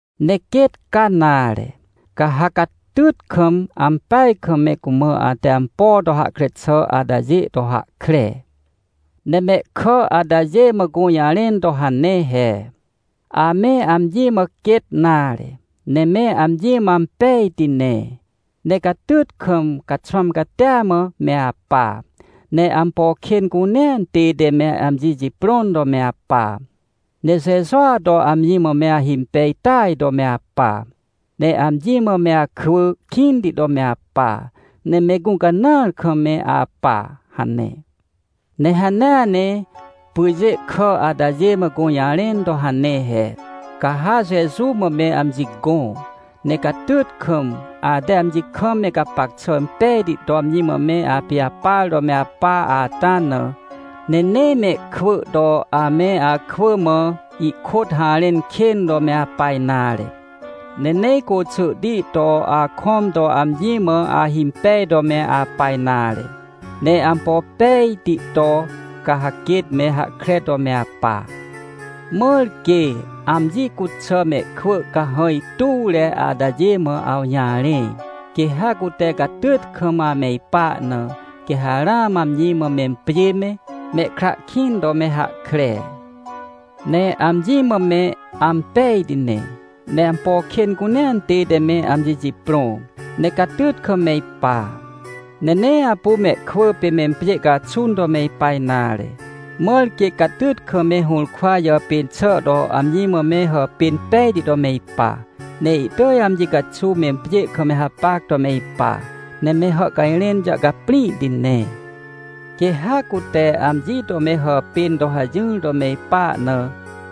Ne quêt ca nare, ca ha catyt kam ampeaj kam me cumã ate ampo to hahkre xà atajê to hahkre. Ne mehkà atajê mã gũjarẽn to hane he: — Ame amji mã quêt nare, ne me amji mã ampejti ne. Ne catyt kam, caxwãm catia mã me apa. Ne ampo kên cunea tête me amji jiprõn to me apa. Ne Jejua to amji mã me ahimpej tỳaj to me apa. Ne amji mã me akwỳ kĩnti to me apa. Ne me gũcanãar kam me apa — hane. Ne hanea ne pyjê kà atajê mã gũjarẽn to hane he: — Ca ha Jeju mã me amji gõ, ne catyt kam, ate amji kam me gapac xà impejti to amji mã me apijapar to me apa ata na. Ne nee mehkwỳ to ame akwỳ mã ihkôt harẽn kên to me apa nare. Ne nee côxỳhti to akõm to amji mã ahimpej to me apa nare. Ne ampo pejti to, ca ha quêt me hahkre to me apa. Mãr quê amji cuxà mehkwỳ cahãj tuwre atajê mã awjarẽ, quê ha cute catyt kam ame ipa na, quê ha ramã amji mã mempjê me, mehkra kĩn to me hahkre. Ne amji mã me ampejti ne, ne ampo kên cunea tête me amji jiprõ, ne catyt kam me ipa, ne nee apu mehkwỳ pê mempjê caxun to me ipa nare. Mãr quê catyt kam me hũrkwa jàpên xà to amji mã me hàpên pejti to me ipa, ne ihtỳj amji caxuw mempjê kam me hapac to me ipa. Ne me hàhcajrẽn jàhcaprĩhti ne. Quê ha cute amji to me hàpên to hajỹr to me ipa na,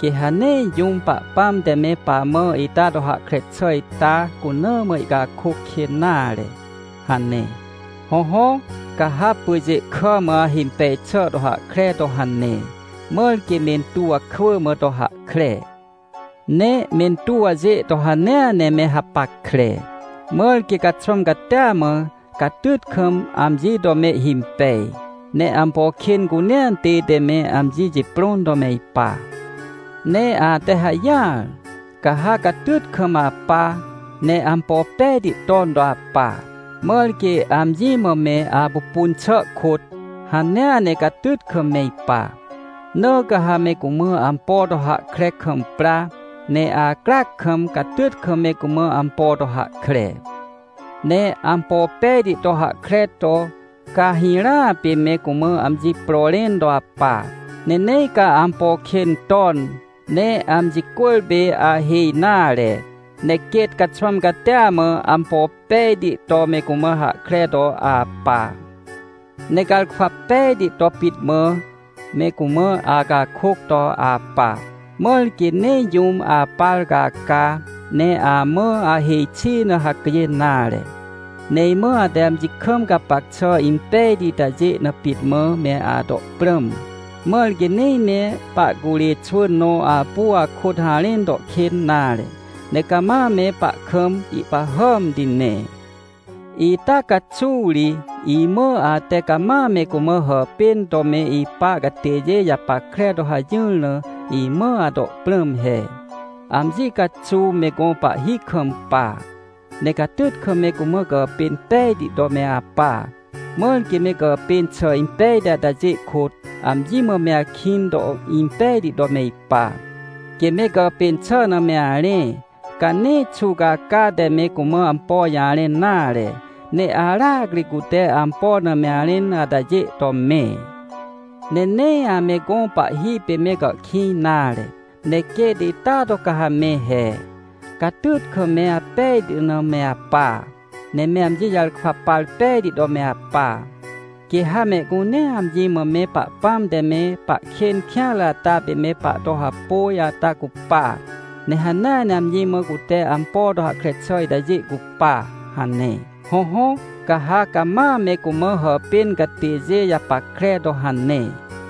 quê ha nee jũm Pahpãm te me pamã ita to hahkre xà ita cuna mã ihcakôc kên nare — hane. Hõhõ, ca ha pyjê kà mã ahimpej xà to hahkre to hane, mãr quê mentuw kwỳ mã to hahkre. Ne mentuwjê to hanea ne me hapackre. Mãr quê caxwãm catia mã, catyt kam amji to mehhimpej, ne ampo kên cunea tête me amji jiprõn to me ipa. Ne ate hajỹar, ca ha catyt kam apa ne ampo pejti ton to apa, mãr quê amji mã me apupun xà kôt, hanea ne catyt kam me ipa. Na ca ha me cumã ampo to hahkre kam pra, ne acryac kam, catyt kam me cumã ampo to hahkre. Ne ampo pejti to hahkre to, ca hirãa pê me cumã amji pro rẽn to apa, ne nee ca ampo kên ton, ne amji cwỳrpê ahêj nare. Ne quêt caxwãm catia mã ampo pejti to me cumã hahkre to apa. Ne garkwa pej to pit mã me cumã acakôc to apa, mãr quê nee jũm apar caca, ne amã ahêj xi na hacjên nare. Ne imã ate amji kam gapac xà impejti itajê na pit mã me ato prãm, mãr quê nee me pahcurê xwỳn nõ apu akôt harẽn to kên nare. Ne cama me pahkam ihpahàmti ne. Ita caxuw ri imã ate cama me cumã hàpên to me ipa catêjê japackre to hajỹr na, imã ato prãm he: — Amji caxuw me gõ pahhi kampa, ne catyt kam me cumã gàpên pejti to me apa, mãr quê me gàpên xà impejti atajê kôt, amji mã me akĩn to impejti to me ipa. Quê me gàpên xà na me arẽ, ca nee xuwcaca te me cumã ampo jarẽn nare, ne aracri cute ampo na me arẽn atajê to me. Ne nee ame gõ pahhi pê me gàhkĩj nare. Ne quêt ita to ca ha me he, catyt kam me apejti na me apa. Ne me amji jarkwa par pejti to me apa. Quê ha mehcunea amji mã me Pahpãm te me pahkên kêanre ata pê me pahto hapôj ata cupa, ne hanea ne amji mã cute ampo to hahkre xà itajê cupa — hane. Hõhõ, ca ha cama me cumã hàpên catêjê japackre to hane.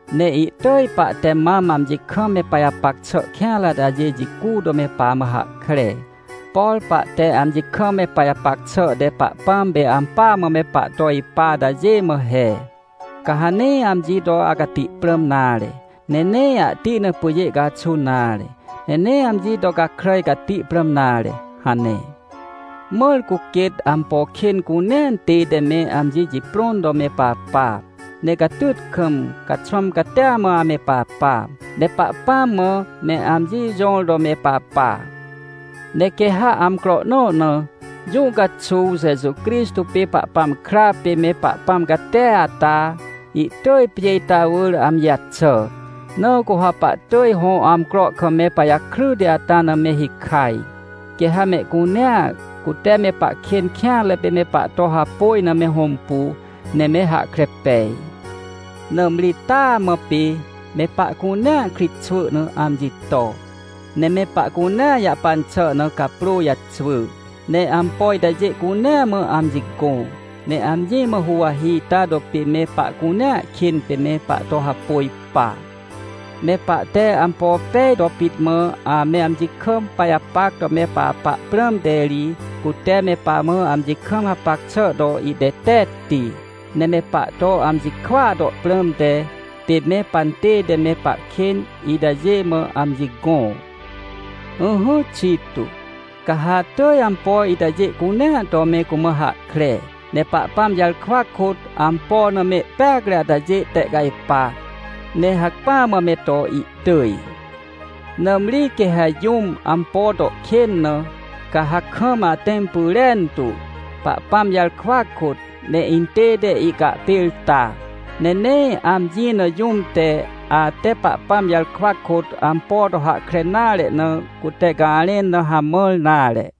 Ne ihtỳj pahte mam amji kam me pajapac xà kêanre atajê jicu to me pamã hahkre. Por pahte amji kam me pajapac xà te Pahpãm pê ampỳa mã me pahto ipa atajê mã he: — Ca ha nee amji to acati prãm nare, ne nee ahti na pyjê caxun nare, ne nee amji to gakràj cati prãm nare — hane. Mãr cu quêt ampo kên cunea tête me amji jiprõn to me papa. Ne catyt kam, caxwãm catia mã ame papa. Ne Pahpãm mã me amji jõr to me papa. Ne quê ha amcro nõ na, jũ caxuw, Jeju Crixtô pê Pahpãm kra pê me Pahpãm catia ata, ihtỳj pjê ita wỳr amji jaxà, na cu ha pahtỳj hõ amcro kam me pajakryti ata na me hikaj. Quê ha mehcunea, cute me pahkên kêanre pê me pahto hapôj na me hõmpu, ne me hahkre pej. Nãmri taa mã pê me pahcunea kritxwỳ na amji to, ne me pahcunea jahpan xà na caprô jaxwỳ, ne ampo itajê cunea mã amji gõ, ne amji mã huwahi ita to pê me pahcunea kên pê me pahto hapôj pa. Me pahte ampo pej to pit mã ame amji kam pajapac to me papa prãmte ri, cute me pamã amji kam hapac xà to ihtetetti. Ne me pahto amji kwỳa to prãmte, pê me pantête me pahkên itajê mã amji gõ. Ỹhỹ, Tito, ca ha atỳj ampo itajê cunea to me cumã hahkre. Ne Pahpãm jarkwa kôt, ampo na mehpeacre atajê tehcajpa, ne hacpỹa mã me to ihtỳj. Nãmri quê ha jũm ampo to kên na, ca ha kam atẽm pyrentu, Pahpãm jarkwa kôt, ne intête ihcahpêrta. Ne nee amji na jũm te, ate Pahpãm jarkwa kôt ampo to hahkre nare na, cute garẽn na hamãr nare.